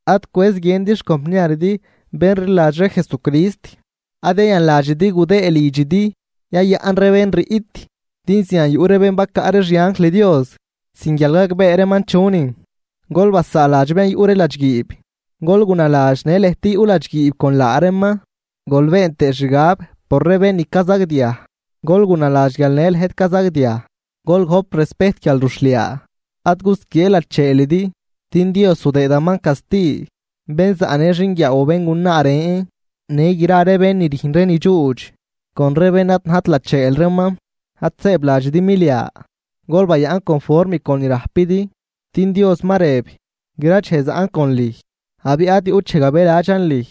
Ad cwëz guiëndi xcompniaridi bén rliladx ree Jesucrist. Ad yayanladxidi gudëë lidxidi yayaꞌn ree bén riꞌt, din zian yuꞌ ree bén bacaꞌ ree xianjl Dios sin guial gagbee reeman chunin. Gol basaaladx bén yuꞌ ree ladxguiib, gol gunaladx guial në lëjt yuꞌ ladxguiib con laa reeman. Gol been tëë xgab por ree bén ni cazagdiaj, gol gunaladx guial në lëjt cazagdiaj. Gol gojp respejt guialruxhliaa, ad gusquiee lacheelidi. Din Dios zudëëdaman casti bén zaꞌnë xinguiaaw o béngunaa ren, në gra ree bén ni rüjn ree ni dxuudx con ree bén ad najt lacheel reeman. Ad sëëbladxidi milia, gol bayaꞌn conform con ni rajpidi din Dios ma rëb: “Gra dxej zaꞌn con lüj, abiꞌ ad yuꞌt dxej gabëladxan lüj.”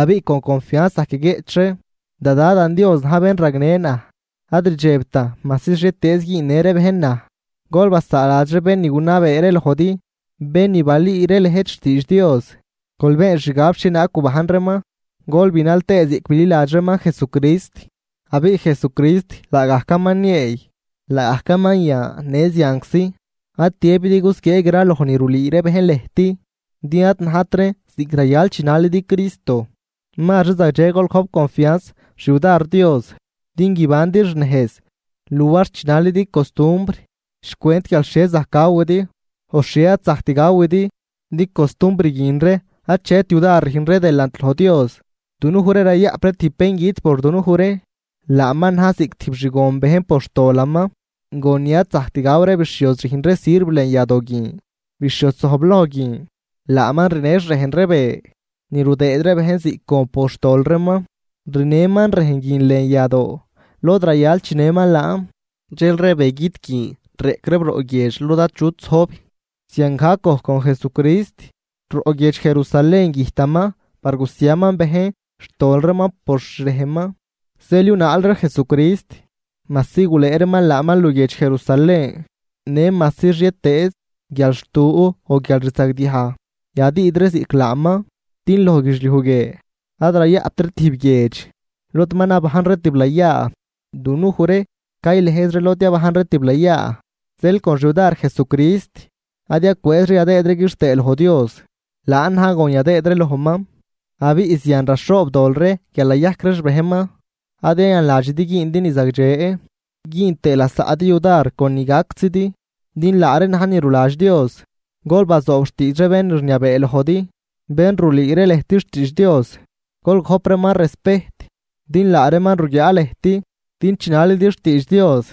Abiꞌ con confianz zajc yaguieꞌch ree: Da Dadan Dios na̱j bén ragnë naj ad rdxebtan majsi xhietëëz güünnë ree bejn naj. Gol basaaladx ree bén ni gunabee ree lojdi, bén ni balüü ree lëjt xtiidx Dios. Gol been xgab xhienaag gubajn reeman gol binal tëë ziꞌc bililadx reeman Jesucrist. Abiꞌ Jesucrist laagajcaman nieey, laagajcaman yan në zianczi. Ad tiëbidi gusquiee graloj ni rulüü ree bejn lëjt, din ad najt reen ziꞌc rayal chinalidi Cristo. Mazri zagdxe gol gojp confianz xyudar Dios din guibandi xnejz luar chinalidi costumbr xcwent guial xhie zajc gawidi o xhie ad zajct gawidi, din costumbr guin ree achet yudar rüjn ree delant loj Dios. Dunuj ree rayaꞌp ree tijb bén güt por dunuj ree, laaman na̱j ziꞌc tijb xgon bejn por xtolaman, gon ni ad zajct gaw ree bixhioz rüjn ree sirv lën yadoo guin. Bixhioz zojbloj guin, laaman rinë xrejn ree be ni rudëëd ree bejn ziꞌc gon por xtol reeman, rinëman rejn guin lën yadoo lod rayal chinëman laan. Dxel ree begüt guin reꞌc reeb roꞌ guiedx lod achut zojb. Ziangajc gojc con Jesucrist, roꞌ guiedx Jerusalén güjtaman par gusiaman bejn xtol reeman por xrejnman. Zeel yunaal ree Jesucrist majsi gulëë reeman laaman luguiedx Jerusalén, në majsi xhietëëz guialxtu o guialrzagdiaj yadüüd ree ziꞌc laaman. Din loj guidxliuj guie ad rayaꞌpt ree tijb guiedx lod ma nabajn ree tiblayaa, dunuj ree caylëjz ree lod yabajn ree tiblayaa. Zeel con xyudar Jesucrist ad yacwëëz ree yadëëd ree quixtëë loj Dios, laan na̱j gon yadëëd ree lojman, abiꞌ zian raxhoobdol ree guial nayajc ree xbejnman. Ad yayanladxidi güündi ni zagdxe güün tëë lasaꞌdi yudar con ni gactzidi, din laa reen na̱j ni ruladx Dios. Gol bazoob xtiidx ree bén rniabee lojdi, bén rulüü ree lëjt xtiidx Dios. Gol gojp reeman respejt din laa reeman ruguiaa lëjt din chinalidi xtiidx Dios,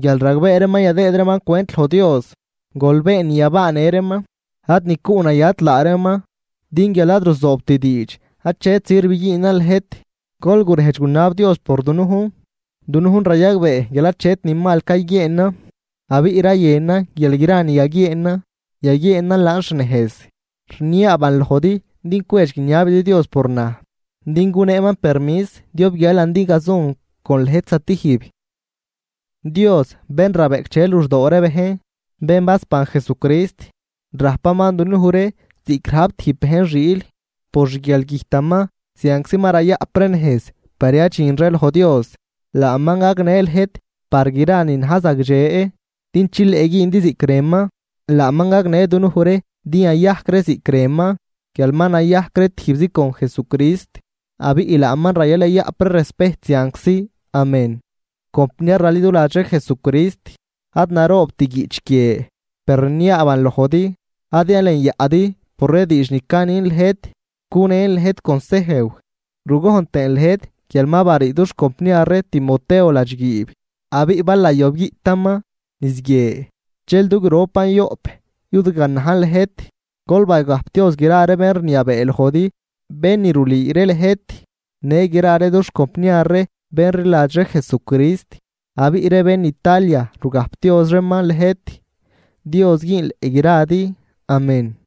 guial ragbee reeman yadëëd reeman cwent loj Dios. Gol been ni yabaanë reeman ad ni cuꞌnayat laa reeman, din guial ad ruzoobt diidx achet sirv güünan lëjt. Gol gurejdx gunab Dios por dunujn. Dunujn rayagbee guial achet ni mal cayguieenan, abiꞌ rayënan guial gra ni yaguieenan, yaguieenan laan xnejz. Rniaaban lojdi din cwedx guiniabidi Dios por naj, din guneeman permis diob guialan din gazun con lëjt zatijb. Dios bén rabeꞌcdxe luxdoo ree bejn, bén basban Jesucrist, rajpaman dunuj ree ziꞌc rajp tijb bejn xiil, por xguialgüjtaman zianczi ma rayaꞌp ree nejz par yadxin ree loj Dios, laaman gagnë lëjt par gra ni na̱j zagdxe din chileꞌ güündi ziꞌc rënman. Laaman gagnë dunuj ree din yayajc ree ziꞌc rënman guial ma nayajc ree tijbzi con Jesucrist. ¡Laaman rayal yayaꞌp ree respejt zianczi! Amén. Compniar raliduladx ree Jesucrist, ad naroobt guiꞌch guie, per rniaaban lojdi ad yalenyaꞌdi por ree diidx ni canin lëjt cunen lëjt consejw. Rugojn tëën lëjt guial ma barii dux compniar ree Timoteo ladxguiib abiꞌ bal nayob guiꞌtaman niz guie, dxel du gropan yoꞌp yudganajn lëjt. Gol bagajpdioz gra ree bén rniabee lojdi bén ni rulüü ree lëjt, në gra ree dux compniar ree bén rliladx ree Jesucrist. Abiꞌ ree bén Italia rugajpdioz reeman lëjt. Dios güünleꞌ gradi. Amén